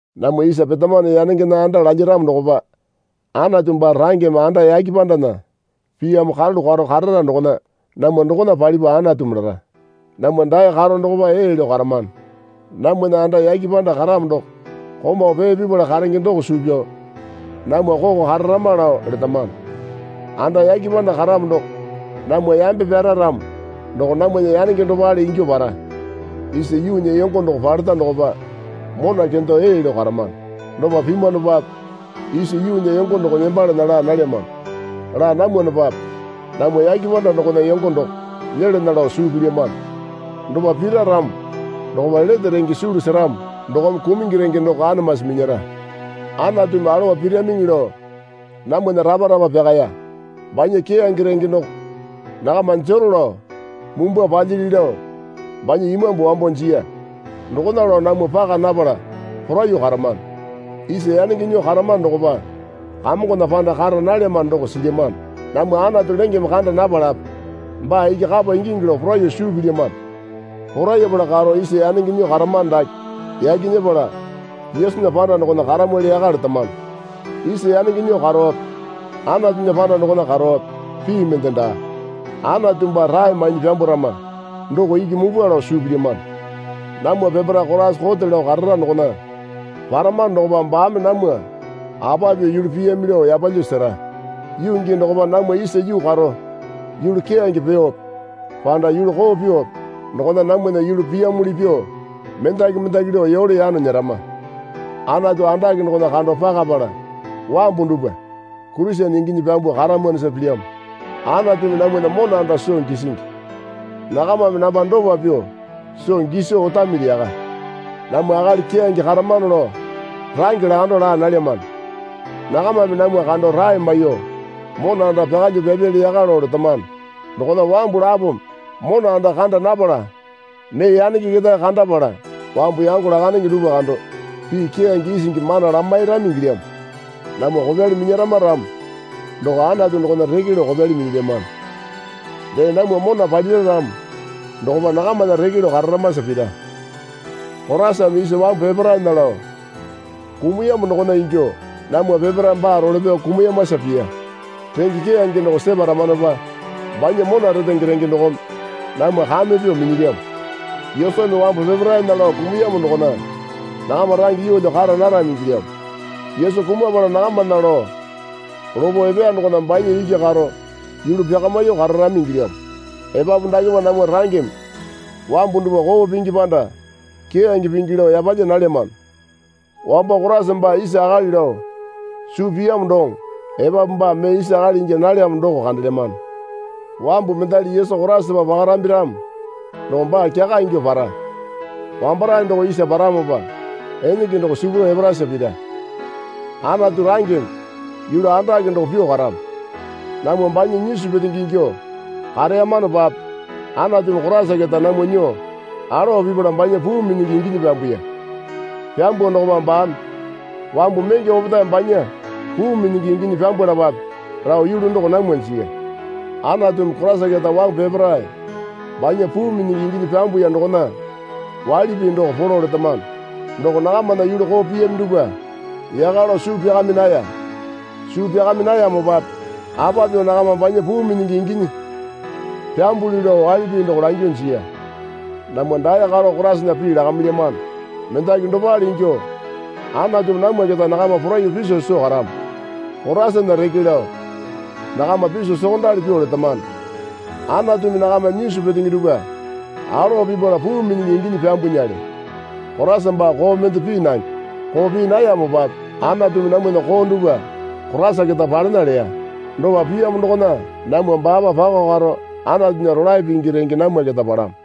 Namwa isa petamano yanengena anda lalyaramo dokopa Anatu baa rangeme anda yake pandana piyamo karalu karo karara dokona namwa dokona palipa Anatumi lara. Namwa dae karo dokopa ee lao karamano. Namwana anda yake panda karamo doko komau pee pipala karenge doko suu pyao namwa koko kararama lao letamano. Anda yake panda karamo doko namwa yambe pyara ramo doko namwana yanenge dopale ingyuo para. Isa yuunya yongo doko paleta dokopa mona kendo ee lao karamano. Dopa pimwanopape isa yuunya yongo doko nembalana laa nalyamano. Laa namwanopape namwa yake panda dokona yongo doko nyelana lao suu pilyamano. Dopa pira ramo dokopa lete renge sulu seramo dokome kumungi renge doko anamasi minyara. Anatumi alowa piramiŋi lao namwana rapa rapa pyakaya. Banya keyange renge doko nakama jero lao mumbwa palyili lao banya Imambu wambo jiya. Dokona lao namwa paka napala poraiyuo karamano. Isa yanenge nyuo karamano dokopa Kamongona panda kara nalyamano doko silyamano. Namwa Anatu lengeme kanda napalape baa iki kapa ingingi lao poraiyuo suu pilyamano. Porayapala karo isa yanenge nyuo karamano dake yaki nyepala Yesunya panda dokona karamwali yaka letamano. Isa yanenge nyuo karowape Anatunya panda dokona karowape pii mende daa. Anatu baa rae mainyi pyambwarama doko iki mupwa lao suu pilyamano. Namwa peparae Koraisa kote lao karara dokona paramano dokopa baame namwa apa pyuo yulu piyami lao yapalyuo sera. Yuu gii dokopa namwa isa yuu karo yulu keyange pyuope panda yulu koo pyuope dokona namwana yulu piyamuli pyuo mendaki mendaki lao yole yano nyerama. Anatu andake dokona kando pakapala wambu dupwa Kurisene inginyi pyambuo karamwanosa pilyamo. Anatumi namwana mona anda soo gisingi. Nakamame namba dopa pyuo soo giso otamili yaka. Namwa akali keyange karamano lao range lakandao laa nalyamano. Nakamame namwa kando rae maiyuo mona anda pyakalyuo pyapyali yaka lao letamano. Dokona wambu lapome mona anda kanda napala mee yanenge ketae kandapala wambu yango lakandenge dupwa kando pii keyange isingi mana lamairami ingilyamo. Namwa kopyali minyarama ramo doko Anatu dokona reke lao kopyali minyilyamano. Dee namwa mona palira ramo dokopa nakamana reke lao kararamasa pira. Koraisame isa wambu peparaena lao kumuyamo dokona ingyuo namwa peparae baa role pyao kumuyamasa piya. Renge keyange doko separamanopa banya mona retenge renge dokome namwa kame pyuo minyilyamo. Yesumi wambu peparaena lao kumuyamo dokona nakama range yeelyo kara narami ingilyamo. Yesu kumapala nakamana lao lopo epeya dokona banya iki karo yulu pyakamyuo kararami ingilyamo. Epapu dakepa namwa rangeme wambu dupwa koo pingi panda keyange pingi lao yapalya nalyamano. Wambo Koraisa baa isa akali lao suu piyamo doŋo epapu baa mee isa akali ingya nalyamo doko kandelyamano. Wambu mendali Yesu Koraisapa pakarambi ramo doko baa kyaka ingyuo para. Wambarae doko isa paramopa enenge doko sipuro eparasa pira. Anatu rangeme yulu andake doko pyuo karamo. Namwa banya nyisu petenge ingyuo kareyamanopape Anatumi Koriasa keta namwa nyuo alowa pipala banya puu minyingi inginyi pyambuya. Pyambuo dokopa baame wambu menge opetae banya puu minyingi inginyi pyambwalapape lao yulu doko namwa jiya. Anatumi Koraisa keta wambu peparae banya puu minyingi inginyi pyambuya dokona waili pii doko polo letamano. Doko nakamana yulu koo piyami dupwa yaka lao suu pyakami naya. Suu pyakami nayamopape apa pyuo nakama banya puu minyingi inginyi pyambulyu lao waili pii doko langyuo jiya. Namwa dae karo Koraisana pii lakamilyamano. Mendaki dopale ingyuo Anatumi namwa keta nakama poraiyuo piso soo karamo. Koraisana reke lao nakama piso sokondali pyuo letamano. Anatumi nakama nyisu petenge dupwa alowa pipala puu minyingi inginyi pyambwanale. Koraisa baa koo mende pii nange. Koo pii nayamopape Anatumi namwana koo dupwa Koraisa keta palena leya. Dopa piyamo dokona namwa baapa pako karo Anatunya rolae pingi renge namwa keta palamo.